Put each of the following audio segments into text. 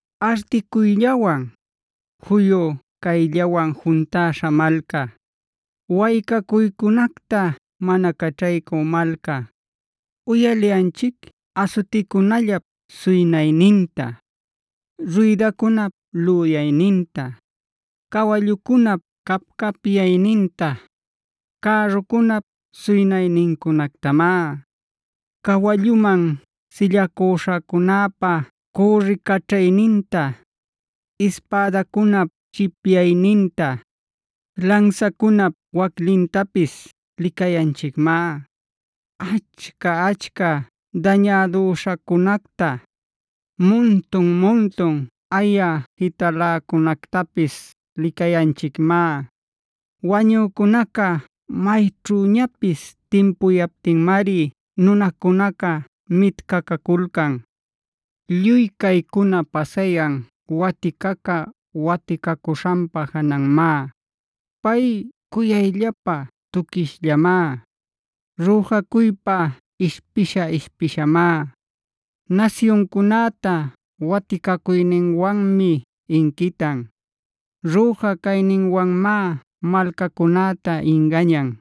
¡Articuyllawan, juyu cayllawan juntäśha malca! ¡Waycacuycunacta mana caćhaycü malca! Uyaliyanchic asuticunallap suynayninta, ruydacunap lüyayninta, cawallucunap cap-capyayninta, cärrucunap suynaynincunactamá. Cawalluman sillacüśhacunäpa cürricaćhayninta, ispädacunap chipyayninta, lansacunap waclintapis licayanchicmá. Achca-achca dañädüśhacunacta, muntun-muntun aya jitaläcunactapis licayanchicmá. Wañücunaca mayćhüñapis timpuyaptinmari nunacunaca mitcacaculcan. Lluy caycuna pasayan waticaca waticacuśhanpa jananmá; pay cuyayllapa tuquishllamá. Rüjacuypá ishpisha-ishpishamá. Nasyuncunäta waticacuyninwanmi inquitan; rüja cayninwanmá malcacunäta ingañan.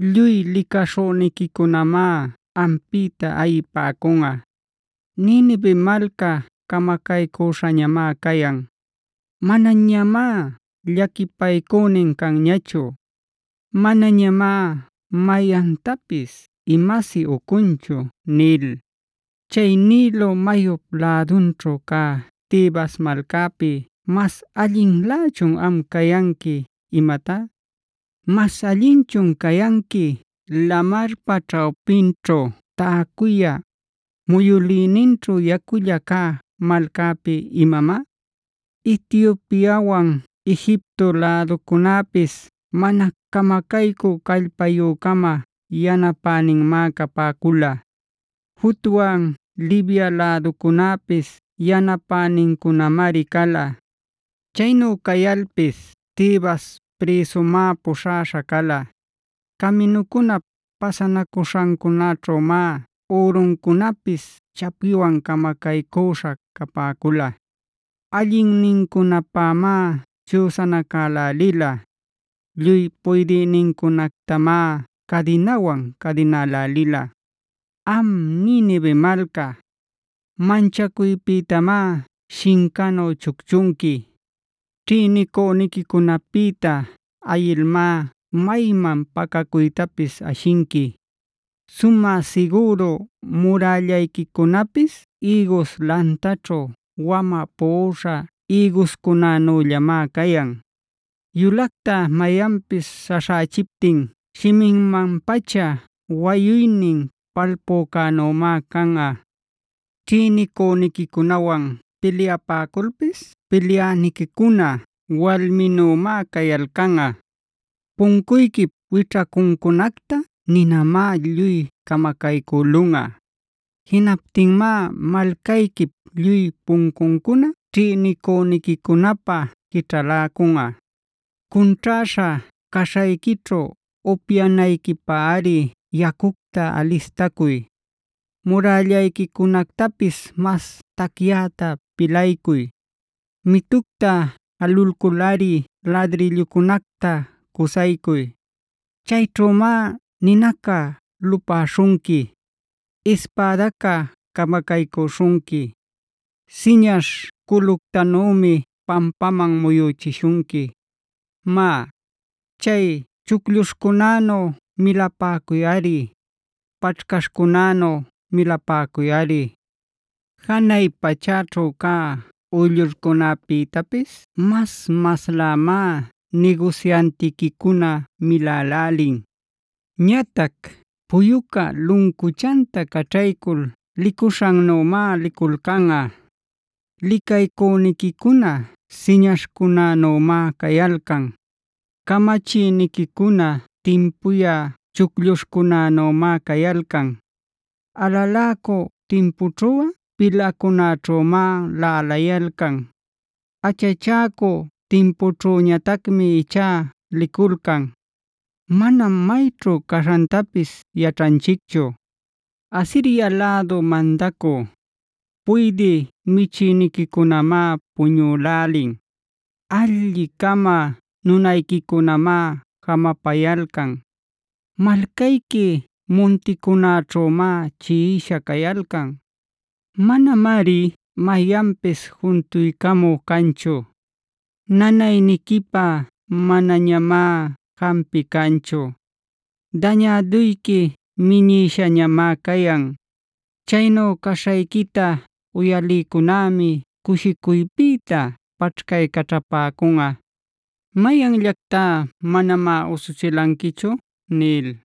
Lluy licaśhüniquicunamá ampïta ayipäcunꞌa: ‘Ninive malca camacaycüśhañamá cayan. Manañamá llaquipaycünin canñachu. Manañamá mayantapis imasi ucunchu’ nil. “¿Chay Nilo mayup lädunćhu cä Tebasb malcapi mas allinlächun am cayanqui imatá? ¿Mas allinchun cayanqui lamarpac ćhawpinćhu täcuyä, muyülïninćhu yaculla cä malcapi imamá? Etiopiawand Egipto läducunäpis mana camacaycü callpayü-cama yanapäninmá capäcula; Futwan Libia läducunäpis yanapänincunamari cala. Chaynu cayalpis Tebas prïsumá puśhaśha cala; caminucunap pasanacuśhancunäćhümá uruncunapis chapiwan camacaycüśha capäcula. Allinnincunapämá chüsanacälälila; lluy puydïnincunactamá cadinawan cadinälälila. “Am Ninive malca, manchacuypïtamá shincanu chucchunqui; ćhïnicüniquicunapïta ayilmá mayman pacacuytapis ashinqui. Sumä sigüru murällayquicunapis ïgus lantaćhu wamä puꞌuśha ïguscunanüllamá cayan; yulacta mayanpis śhaśhächiptin shiminman-pacha wayuynin palpücänümá canꞌa. Ćhïnicüniquicunawan pilyapäculpis pilyäniquicuna walminümá cayalcanꞌa. Puncuyquip wićhacuncunacta ninamá lluy camacaycülunꞌa. Jinaptinmá malcayquip lluy puncuncuna ćhïnicüniquicunapä quićhaläcunꞌa. “Cunćhäśha caśhayquićhu upyanayquipäri yacucta alistacuy. Murällayquicunactapis mas tacyäta pilaycuy; mitucta jalulculꞌari ladrillucunacta cusaycuy. Chayćhümá ninaca lupäśhunqui; ispädaca camacaycüśhunqui, siñaśh culütanümi pampaman muyüchishunqui. Má, chay chuclluśhcunänu milapäcuyꞌari, paćhcaśhcunänu milapäcuyꞌari. “Janay pachäćhu cä uyllurcunäpïtapis mas-maslämá nigusyantiquicuna milälälin. Ñatac puyuca luncuchanta caćhaycul licuśhannümá liculcanꞌa. Licaycüniquicuna siñaśhcunänümá cayalcan; camachïniquicuna timpuyä chuclluśhcunänümá cayalcan. Alaläcü timpućhuꞌa pilacunäćhümá laꞌalayalcan. Acachäcü timpućhüñatacmi ichá liculcan; manam mayćhu caśhantapis yaćhanchicchu. “Asiria lädu mandacü, puydï michïniquicunamáe puñülälin; alli-cama nunayquicunamá jamapayalcan. Malcayqui munticunäćhümá chiꞌisha cayalcan; manamari mayanpis juntuycamü canchu. Nanayniquipä manañamá jampï canchu; dañäduyqui minïshañamá cayan.f Chaynu caśhayquita uyalïcunämi cushicuypïta paćhcaycaćhapäcunꞌa. ¿Mayanllactá manamá usuchilanquichu?” nil.